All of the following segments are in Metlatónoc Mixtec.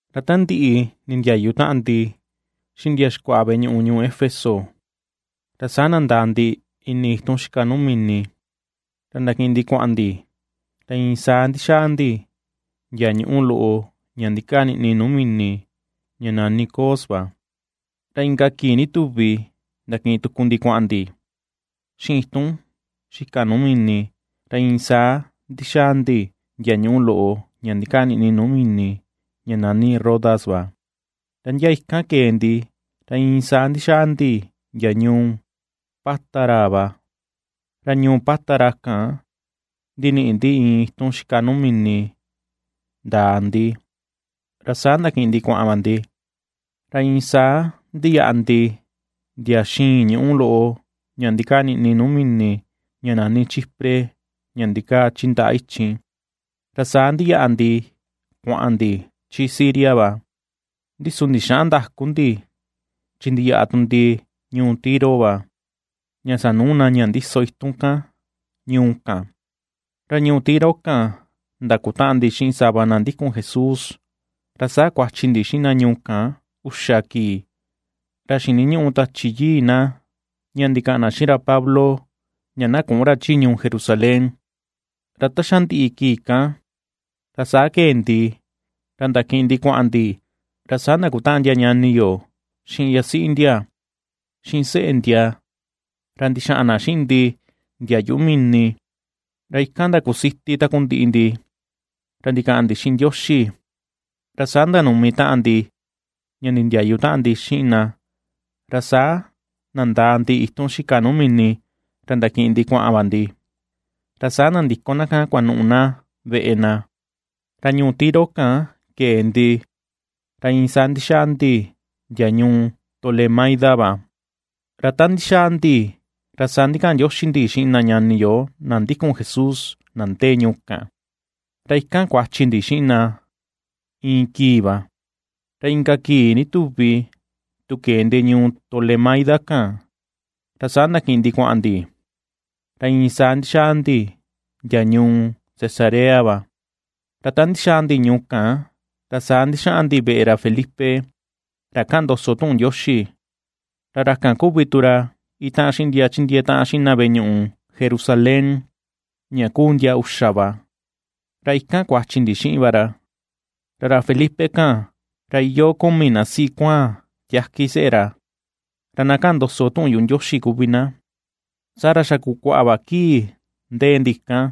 Ra ta ndiꞌi nindiayu taꞌan ndi xiꞌin ndia xikuaꞌa veꞌe ñuꞌu ñuu Éfeso, ra saa nandaa ndi ini itun xika nuu mini, ra ndakiꞌin ndi kuaꞌan ndi, ra iin saa ndixaa ndi ndia ñuꞌu loꞌo ña ndikaa niꞌni nuu mini ña nani Cos va. Ra inka kii ndituvi ndakiꞌin tuku ndi kuaꞌan ndi xiꞌin itun xika nuu mini, ra iin saa ndixaa ndi ndia ñuꞌu loꞌo ña ndikaa niꞌni nuu mini ña nani Rodas va, ra ndia ikan kee ndi, ra iin saa ndixaa ndi ndia ñuu Pátara va. Ra ñuu Pátara kan ndiniꞌi ndi iin itun xika nuu mini ndaa ndi, ra saa ndakiꞌin ndi kuaꞌan va ndi. Ra iin saa ndiyaꞌa ndi ndia xiin ñuꞌu loꞌo ña ndikaa niꞌni nuu mini ña nani Chipre ña ndikaa chi ndaꞌa ichin, ra saa ndiyaꞌa ndi kuaꞌan ndi chi Siria va. Ndi su ndixäꞌan ndaku ndi chi ndiyaꞌa tu ndi ñuu Tiro va, ña sanuu na ña ndiso itun kan ñuu kan. Ra ñuu Tiro kan ndakutaꞌan ndi xiꞌin sava na ndikun Jesús, ra saa kuachi ndi xiꞌin na ñuu kan uxa kii. Ra xiniñuꞌu Tachi Yii na ña ndikaꞌan na xiꞌin Pablo ña na küꞌun ra chi ñuu Jerusalén. Ra ta xa ndiꞌi kii kan, ra saa kee ndi ra ndakiꞌin ndi kuaꞌan ndi, ra saa ndakutaꞌan ndia ñani yo xiꞌin yasiꞌi ndia, xiꞌin seꞌe ndia, ra ndixaꞌan na xiꞌin ndi ndia yuꞌu mini, ra ikan ndakusiti takundiꞌi ndi ra ndikaꞌan ndi xiꞌin Ndioxi. Ra saa ndanumi taꞌan ndi ña ndindiayu taꞌan ndi xiꞌin na, ra saa nandaa ndi itun xika nuu mini ra ndakiꞌin ndi kuaꞌan va ndi, ra saa nandiko na kan kuanuꞌu na veꞌe na. Ra ñuu Tiro kan kee ndi, ra iin saa ndixaa ndi ndia ñuu Tolemaida va, ra ta ndixaa ndi ra saa ndikaꞌan ndioxi ndi xiꞌin na ñani yo na ndikun Jesús, na ndee ñuu kan, ra ikan kuachi ndi xiꞌin na iin kii va. Ra inka kii ndutuvi tu kee ndi ñuu Tolemaida kan, ra saa ndakiꞌin ndi kuaꞌan ndi, ra iin saa ndixaa ndi ndia ñuu Cesarea va. Ra ta ndixaa ndi ñuu kan, ra saa ndixaꞌan ndi veꞌe ra Felipe, ra kaꞌan ndoso tuꞌun Ndioxi, ra ra kan kuvi tu ra itaꞌan xiꞌin ndia chindiee taꞌan xiꞌin na veꞌe ñuꞌu Jerusalén, ña kuu ndia uxa va, ra ikan kuachi ndi xiꞌin va ra. Ra ra Felipe kan, ra iyoo kumi na siꞌi kuaan tiaki seꞌe ra, ra na kaꞌan ndoso tuꞌun yuꞌu Ndioxi kuvi na. Saa ra xa kukuaꞌa va kii ndee ndi kan,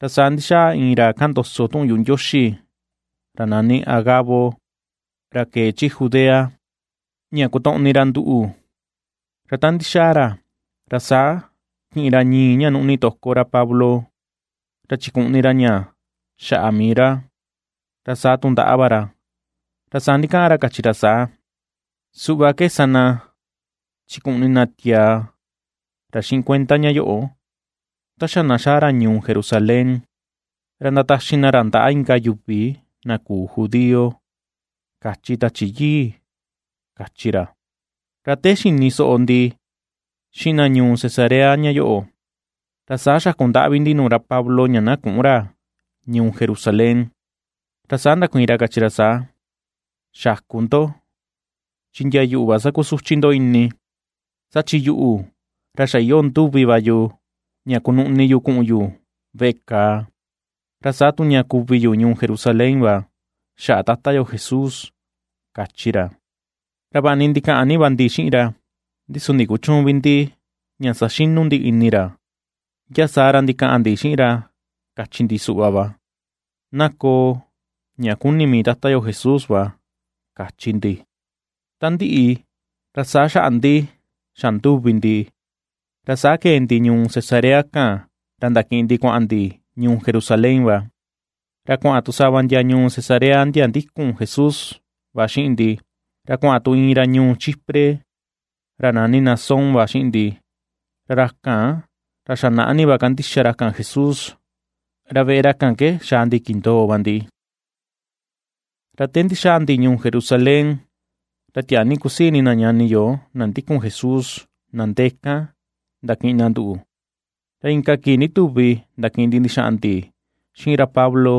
ra saa ndixaa iin ra kaꞌan ndoso tuꞌun yuꞌu Ndioxi, ra nani Agabo, ra kee chi Judea, ña kotoꞌni ra nduꞌu. Ra ta ndixaa ra, ra saa kiꞌin ra ñii ña nuꞌni toko ra Pablo, ra chikuꞌni ra ña xaꞌa mii ra, ra saa tu ndaꞌa va ra, ra saa ndikaꞌan ra, kachi ra saa: ―Suꞌva ke sa na chikuꞌni na tiaa ra xiꞌin cuenda ña yoꞌo, ta xa na xaa ra ñuu Jerusalén, ra ndataxi na ra ndaꞌa inka yuvi na küu judío, kachi Tachi Yii ―kachi ra. Ra te xini soꞌo ndi xiꞌin na ñuu Cesarea ña yoꞌo, ra saa xaku ndaꞌvi ndi nuu ra Pablo ña na küꞌun ra ñuu Jerusalén. Ra saa ndakuiin ra, kachi ra saa: ―Xäku ndo, chi ndia yuꞌu va sakusuchi ndo ini. Saa chi yuꞌu ra xa iyoo nduvi va yu, ña kunuꞌni yu kuꞌun yu veꞌe kàà, ra saa tu ña kuvi yu ñuu Jerusalén va, xaꞌa Tata yo Jesús ―kachi ra. Ra vaꞌa ni ndikaꞌan ni va ndi xiꞌin ra, ndi su ndikuchüun vi ndi ña saxinu ndi ini ra, ndia saa ra ndikaꞌan ndi xiꞌin ra, kachi ndi suꞌva va: ―Na koo ña kuni mii Tata yo Jesús va ―kachi ndi. Ta ndiꞌi, ra saa xaꞌa ndi xa nduvi ndi, ra saa kee ndi ñuu Cesarea kan, ra ndakiꞌin ndi kuaꞌan ndi ñuu Jerusalén va. Ra kuaꞌan tu sava ndia ñuu Cesarea ndia ndikun Jesús va xiꞌin ndi, ra kuaꞌan tu iin ra ñuu Chipre, ra nani Nasón va xiꞌin ndi, ra ra kan ra xa naꞌa ni va kandixa ra kan Jesús, ra veꞌe ra kan ke xaa ndi kindoo va ndi. Ra te ndixaa ndi ñuu Jerusalén, ra tiaa ni kusii ini na ñani yo, na ndikun Jesús, na ndee kan ndakiꞌin na nduꞌu. Ra inka kii ndituvi ndakiꞌin ndi ndixaꞌan ndi xiꞌin ra Pablo,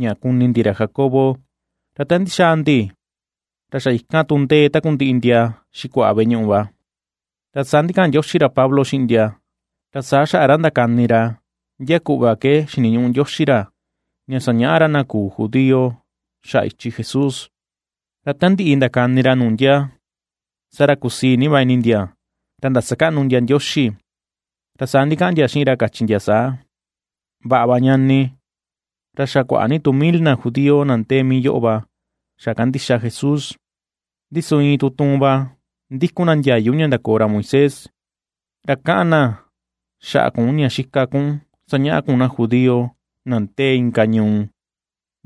ña kuni ndi ra Jacobo. Ra ta ndixaa ndi ra xa ikan tu ndee takundiꞌi ndia xikuaꞌa veꞌe ñuꞌu va. Ra saa ndikaꞌan ndioxi ra Pablo xiꞌin ndia, ra saa xaꞌa ra ndakani ra ndia kuꞌva ke xiniñuꞌu Ndioxi ra, ña sañaꞌa ra na küu judío xaꞌa ichi Jesús. Ra ta ndiꞌi ndakani ra nuu ndia, saa ra kusii ni va ini ndia ra ndasakaꞌnu ndia Ndioxi. Ra saa ndikaꞌan ndia xiꞌin ra, kachi ndia saa: ―Vaꞌa va, ñani, ra xa kuaꞌa ni tu mil na judío na ndee mii yoꞌo va xa kandixa Jesús, ndi su iin tutuun va ndikun na ndiayu Ndioxi ña ndakoo ra Moisés. Ra kaꞌan na xaꞌa kun ña xika kun sañaꞌa kun na judío na ndee inka ñuu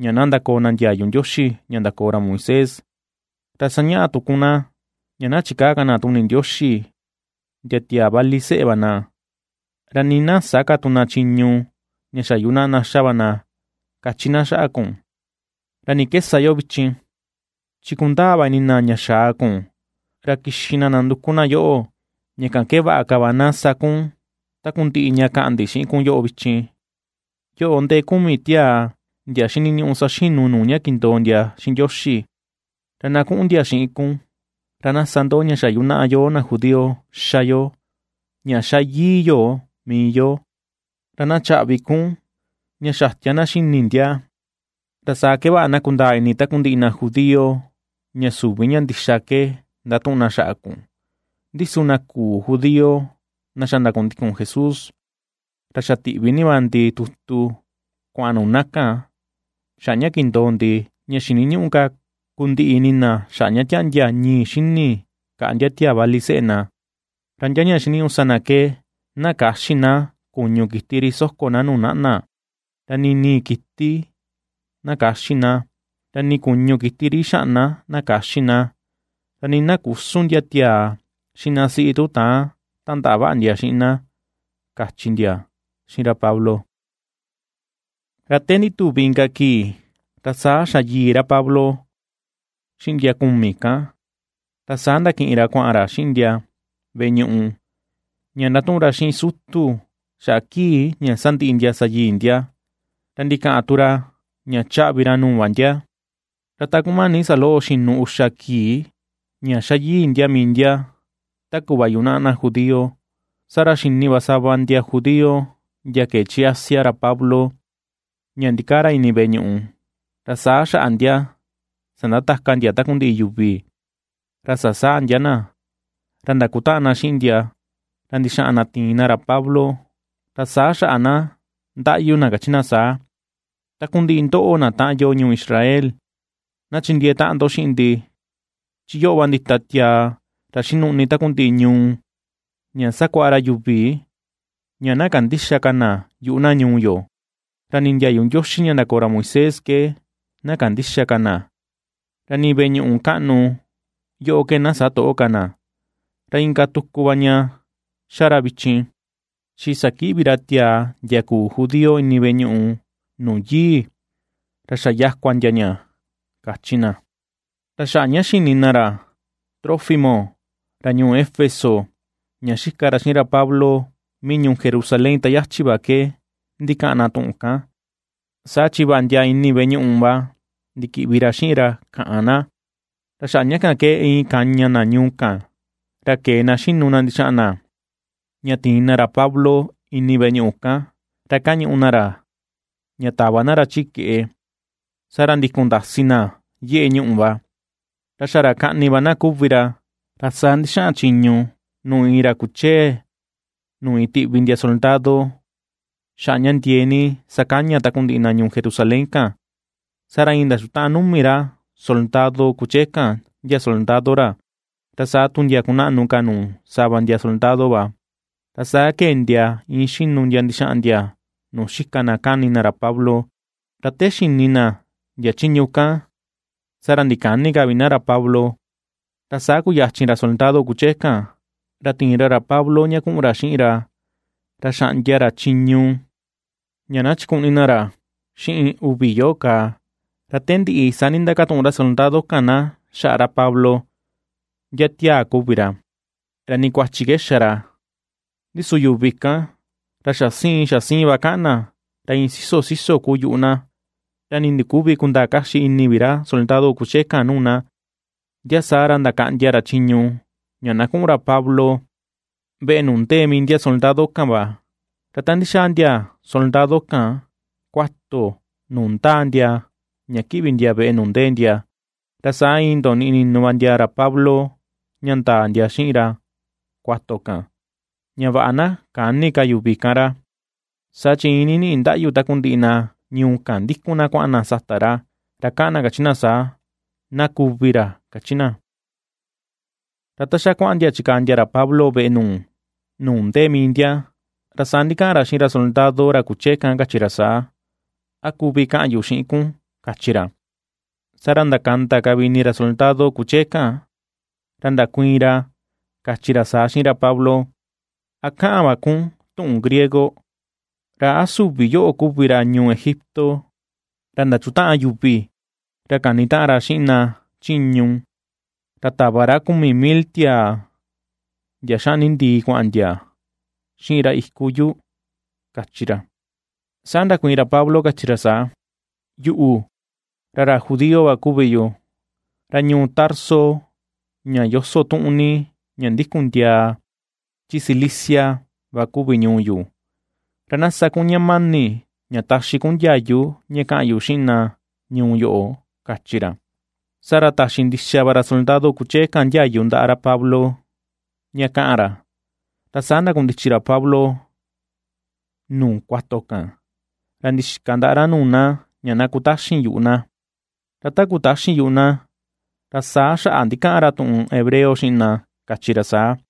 ña na ndakoo na ndiayu Ndioxi ña ndakoo ra Moisés. Ra sañaꞌa tu kun na, ña na chikäa ka na tuni Ndioxi ndia tiaa vali seꞌe va na, ra nii na sä ka tu na chiñu ña xa yunaꞌa na xa va na, kachi na xaꞌa kun. ¿Ra ni ke sa yo vichin? Chi kundaa va ini na ña ^xaa kun, ra kixi va na nanduku na yoꞌo. Ña kan ke vaꞌa ka va na sa kun takundiꞌi ña kaꞌan ndi xiꞌin kun vichin: Yoꞌo ndee kumi tiaa ndia xiniñuꞌu saxinu nuu ña kindoo ndia xiꞌin Ndioxi. Ra na kuꞌun ndia xiꞌin kun, ra na sa ndo ña xa yunaꞌa yoo na judío xa yo ña xa yii yo mii yo, ra na chaꞌvi kun ña xatia na xini ndia, ra sa ke vaꞌa na kundaa ini takundiꞌi na judío ña süvi ña ndixa ke ndatuꞌun na xaꞌa kun. Ndi su na küu judío na xa ndakundikun Jesús, ra xa tiꞌvi va ndi tutu kuaꞌan nuu na kan, xaꞌa ña kindoo ndi, ña xiniñüꞌu ka kundiꞌi ini xaꞌa ña tiaꞌndia ñii xini kaꞌa ndia tiaa vali seꞌe na, ra ndia ña xiniñuꞌu sa na ke: na käxi na kuñu kiti ri soko na nuu naꞌna, ra nii ni̱i̱ kiti na käxi na, ra nii kuñu kiti ri ixaꞌna na käxi na, ra nii na küsun ndia tiaa xiꞌin na siꞌi tu täan tandaꞌa vaꞌa ndia xiꞌin na ―kachi ndia xiꞌin ra Pablo. Ra te ndituvi inka kii, ra saa xa yii ra Pablo xiꞌin ndia kumi kan, ra saa ndakiꞌin ra kuaꞌan ra xiꞌin ndia veꞌe ñuꞌu, ña ndatuꞌun ra xiꞌin sutu xaꞌa kii ña sandiꞌi ndia sa yii ndia, ra ndikaꞌan tu ra ña chaꞌvi ra nuu va ndia. Ra ta kumani saloꞌo xinu uxa kii ña xa yii ndia mii ndia ta kuꞌva yunaꞌa na judío, saa ra xini va sava ndia judío ndia kee chi Asia, ra Pablo ña ndikaa ra ini veꞌe ñuꞌu, ra saa xaꞌa ndia sandataka ndia takundiꞌi yuvi. Ra sasaa ndia na, ra ndakutaꞌan na xiꞌin ndia ra ndixaꞌan na tiin na ra Pablo. Ra saa xaꞌa na ndaꞌyu na, kachi na saa: ―¡Takundiꞌi ndoꞌo na taꞌan yo ñuu Israel, na chindiee taꞌan ndo xiꞌin ndi! Chi yoꞌo va ndita tiaa ra xinuꞌni takundiꞌi ñuu, ña sakuaꞌa ra yuvi, ña na kandïxa ka na yuꞌu na ñuu yo, ra ni ndiayu Ndioxi ña ndakoo ra Moisés ke na kandïxa ka na, ra nii veꞌe ñuꞌu kaꞌnu yoꞌo ke na sä toꞌo ka na. Ra inka tuku va ña xa ra vichin, chi sakiꞌvi ra tiaa ndia küu judío ini veꞌe ñuꞌu nuu yii, ra xa yakua ndia ña ―kachi na. Ra xaꞌa ña xini na ra Trófimo ra ñuu Éfeso ña xika ra xiꞌin ra Pablo mii ñuu Jerusalén ta yachi va ke ndikaꞌan na tuꞌun kan, saa chi va ndia ini veꞌe ñuꞌu va ndikiꞌvi ra xiꞌin ra kaꞌan na. Ra xaꞌa ña kan ke iin kaña na ñuu kan, ra kee na xinu ndixaꞌan na ña tiin na ra Pablo ini veꞌe ñuꞌu kan ra kañuꞌu na ra ña tava na ra chi keꞌe, saa ra ndikun ndasi na yeꞌe ñuꞌu va. Ra xa ra kaꞌni va na kuvi ra, ra saa ndixaꞌan chiñu nuu iin ra kuchee nuu iin tiꞌvi ndia soldado, xaꞌa ña ndiee ni sakaña takundiꞌi na ñuu Jerusalén kan. Saa ra iin ndachutaꞌan numi ra soldado kuchee kan, ndia soldado ra, ra saa tu ndia kunaꞌnu ka tu nuu sava ndia soldado va, ra saa kee ndia iin xinu ndia ndixaa ndia nuu xika na kani na ra Pablo, ra te xini na ndia chiñu kan, saa ra ndikäni ka vi na ra Pablo. Ra saa kuyachin ra soldado kuchee kan, ra tiin ra ra Pablo ña kuꞌun ra xiꞌin ra, ra xaꞌndia ra chiñu ña na chikuꞌni ra xiꞌin uvi yoꞌo kaa; ra te ndiꞌi saa ndindakatuꞌun ra soldado kan na xaꞌa ra Pablo, ndia tiaa kuvi ra, ra ni kuachi ke xa ra. Ndi su yuvi kan, ra xa siin, xa siin va kaꞌan na, ra iin siso siso kuu yuꞌu na, ra nii ndiküvi kundaa kaxi ini vi ra soldado kuchee kan nuu na, ndia saa ra ndakaꞌndia ra chiñu ña na kuꞌun ra Pablo, veꞌe nuu ndee mii ndia soldado kan va. Ra ta ndixaa ndia soldado kan kuato nuu ^ndaa ndia ña kiꞌvi ndia veꞌe nuu ndee ndia, ra saa iin ndoniꞌi ninu va ndia ra Pablo ña ndaa ndia xiꞌin ra kuato kan, ña vaꞌa na käni ka yuvi kan ra. Saa chi iin niniꞌi ndaꞌyu takundiꞌi na ñuu kan ndikun na kuaꞌan na sata ra, ra kaꞌan na kachi na saa: ―¡Na kuvi ra! ―kachi na. Ra ta xa kuaꞌan ndia chikaa ndia ra Pablo veꞌe nuu ndee mii ndia, ra saa ndikaꞌan ra xiꞌin ra soldado ra kuchee kan, kachi ra saa: ―¿A kuvi kaꞌan yu xiꞌin kun? ―kachi ra. Saa ra ndakanda ka vi ini ra soldado kuchee kan ra ndakuiin ra, kachi ra saa xiꞌin ra Pablo: ―¿A kaꞌan va kun tuꞌun griego? ¿Ra a süvi yoꞌo kuvi ra ñuu Egipto, ra ndachutaꞌan yuvi ra kanitaꞌan ra xiꞌin na chiñu, ra tava ra kumi mil tiaa, ndia xaꞌni ndii kuaꞌan ndia xiꞌin ra iku yu? ―kachi ra. Saa ndakuiin ra Pablo, kachi ra saa: ―Yuꞌu, ra ra judío va kuvi yu, ra ñuu Tarso ña yoso tuꞌun ni, ña ndikun ndiaa chi Cilicia va kuvi ñuu yu. Ra na sa kun ña mani ña taxi kun ndiayu ña kaꞌan yu xiꞌin na ñuu yoꞌo ―kachi ra. Saa ra taxi ndixa va ra soldado kuchee kan ndiayu ndaꞌa ra Pablo ña kaꞌan ra. Ra saa ndakundichi ra Pablo nuu kuato kan, ra ndixika ndaꞌa ra nuu na ña na kutaxin yuꞌu na. Ra te kutaxin yuꞌu na, ra saa xaꞌa ndikaꞌan ra tuꞌun hebreo xiꞌin na, kachi ra saa: